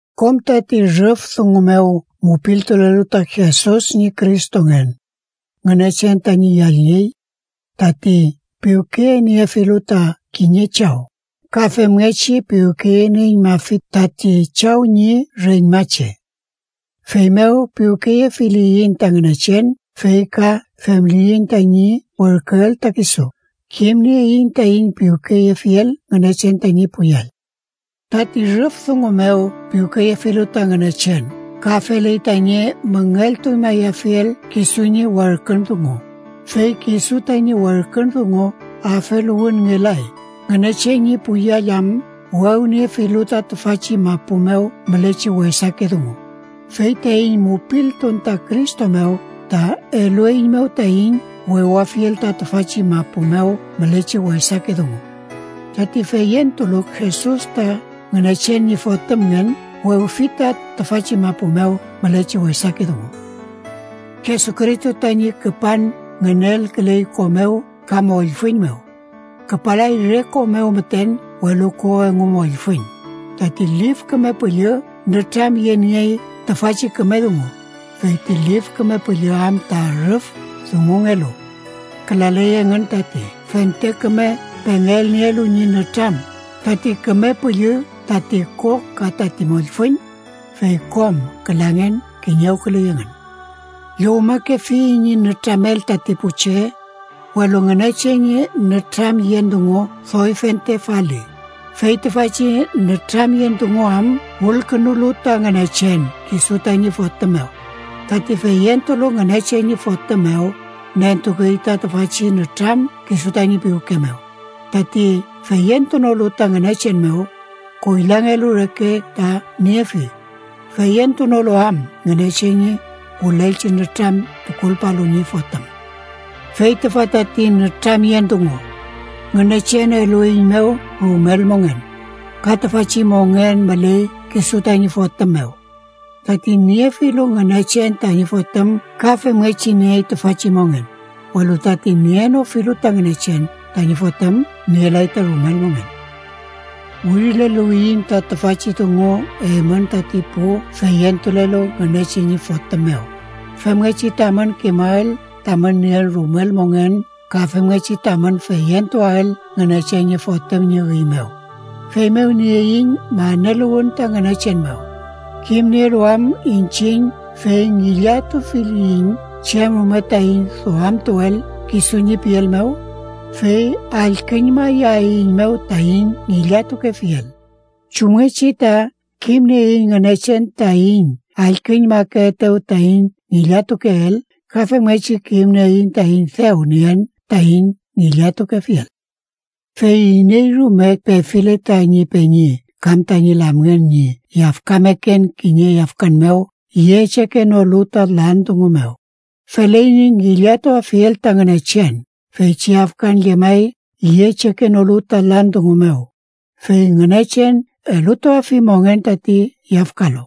Kom tati rüf dungu mew mupiltulelu ta Jesus ñi Cristongen, Ngünechen tañi yallngey. Tati piwkeyeniefilu ta kiñe chaw, ka femngechi piwkeyenieñmafi tati chaw ñi reñmache. Feymew piwkeyefiliyiñ ta Ngünechen fey ka femliyiñ tañi werküel ta kisu, kimnieiñ taiñ piwkeyefiel Ngünechen tañi pu yall. Tati rüf dungu mew piwkeyefilu ta Ngünechen ka feley tañi müngeltuñmayafiel kisu ñi werkün dungu. Fey kisu tañi werkün dungu afeluwünngelay, Ngünechen ñi pu yall am wewniefilu ta tüfachi mapu mew mülechi wesake dungu. Fey taiñ mupiltun ta Cristo mew ta elueiñmew taiñ wewafiel ta tüfachi mapu mew mülechi wesake dungu. Tati feyentulu Jesus ta Ngünechen ñi Fotümngen, wewfi ta tüfachi mapu mew mülechi wesake dungu. Jesucristo tañi küpan ngünelküley ko mew ka mollfüñ mew. Küpalay re ko mew müten, welu ko engu mollfüñ. Tati Lif Küme Püllü nütramyeniey tüfachi küme dungu, fey ti Lif Küme Püllü am ta rüf dungungelu. Külaley engün tati fente küme pengelnielu ñi nütram: tati Küme Püllü, tati ko ka tati mollfüñ, fey kom külangen kiñewküley engün. Llowmakefiyiñ ñi nütramel tati pu che, welu Ngünechen ñi nütramyen dungu doy fentre faliy, fey tüfachi nütramyen dungu am wülkünulu ta Ngünechen kisu tañi Fotüm mew. Tati feyentulu Ngünechen ñi Fotüm mew, nentukey ta tüfachi nütram kisu tañi piwke mew. Tati feyentunolu ta Ngünechen mew, koylangelu reke ta niefi, feyentunolu am Ngünechen ñi wülelchi nütram tukulpalu ñi Fotüm. Fey tüfa tati nütramyen dungu: Ngünechen elueiñmew rumel mongen, ka tüfachi mongen müley kisu tañi Fotüm mew. Tati niefilu Ngünechen tañi Fotüm ka femngechi niey tüfachi mongen, welu tati nienofilu ta Ngünechen tañi Fotüm, nielay ta rumel mongen. Wirileluwiyiñ ta tüfachi dungu eymün tati pu feyentulelu Ngünechen ñi Fotüm mew, femngechi tamün kimael tamün nien rumel mongen ka femngechi tamün feyentuael Ngünechen ñi Fotüm ñi üy mew. Feymew nieiñ maneluwün ta Ngünechen mew, kimnielu am iñchiñ fey ngillatufiliyiñ chem rume taiñ duamtuel kisu ñi piel mew, fey allküñmayaeiñmew taiñ ngillatukefiel. Chumngechi ta kimnieiñ Ngünechen taiñ allküñmakeetew taiñ ngillatukeel, ka femngechi kimnieiñ taiñ dew nien taiñ ngillatukefiel. Fey iney rume pefile tañi peñi kam tañi lamngen ñi yafkameken kiñe yafkan mew yechekenolu ta lan dungu mew, feley ñi ngillatuafiel ta Ngünechen. Feychi yafkan llemay yechekenolu ta lan dungu mew, fey Ngünechen elutuafi mongen tati yafkalu.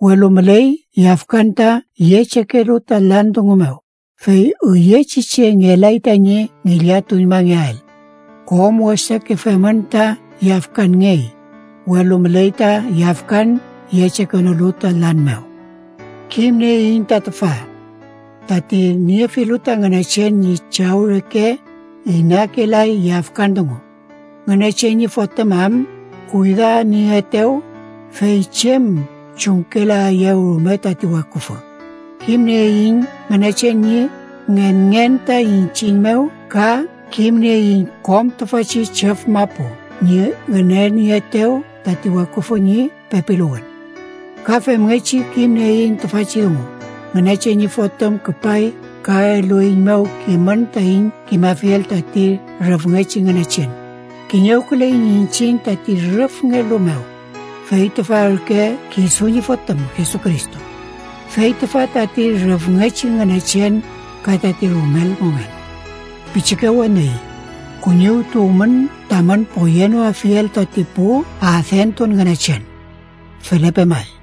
Welu müley yafkan ta yechekelu ta lan dungu mew, fey üyechi che ngelay tañi ngillatuñmangeael. Kom wesake femün ta yafkanngey, welu müley ta yafkan yechekenolu ta lan mew. Kimnieiñ ta tüfa: tati niefilu ta Ngünechen ñi Chaw reke, inakelay yafkan dungu, Ngünechen ñi Fotüm am kuydanieetew, fey chem chumkelaeyew rume tati weküfü. Kimnieiñ Ngünechen ñi ngenngen ta iñchiñ mew ka kimnieiñ kom tüfachi chüf mapu ñi ngünenieetew tati weküfü ñi pepiluwün. Ka femngechi kimnieiñ tüfachi dungu: Ngünechen ñi Fotüm küpay ka elueiñmew kimün taiñ kimafiel tati rüfngechi Ngünechen. Kiñewküleiñ iñchiñ tati rüfngelu mew, fey tüfa ürke kisu ñi Fotüm Jesucristo. Fey tüfa tati rüfngechi Ngünechen ka tati rumel mongen. Pichike weni, kuñiwtuwmün tamün poyenoafiel tati pu adentun ngünechen. Felepe may.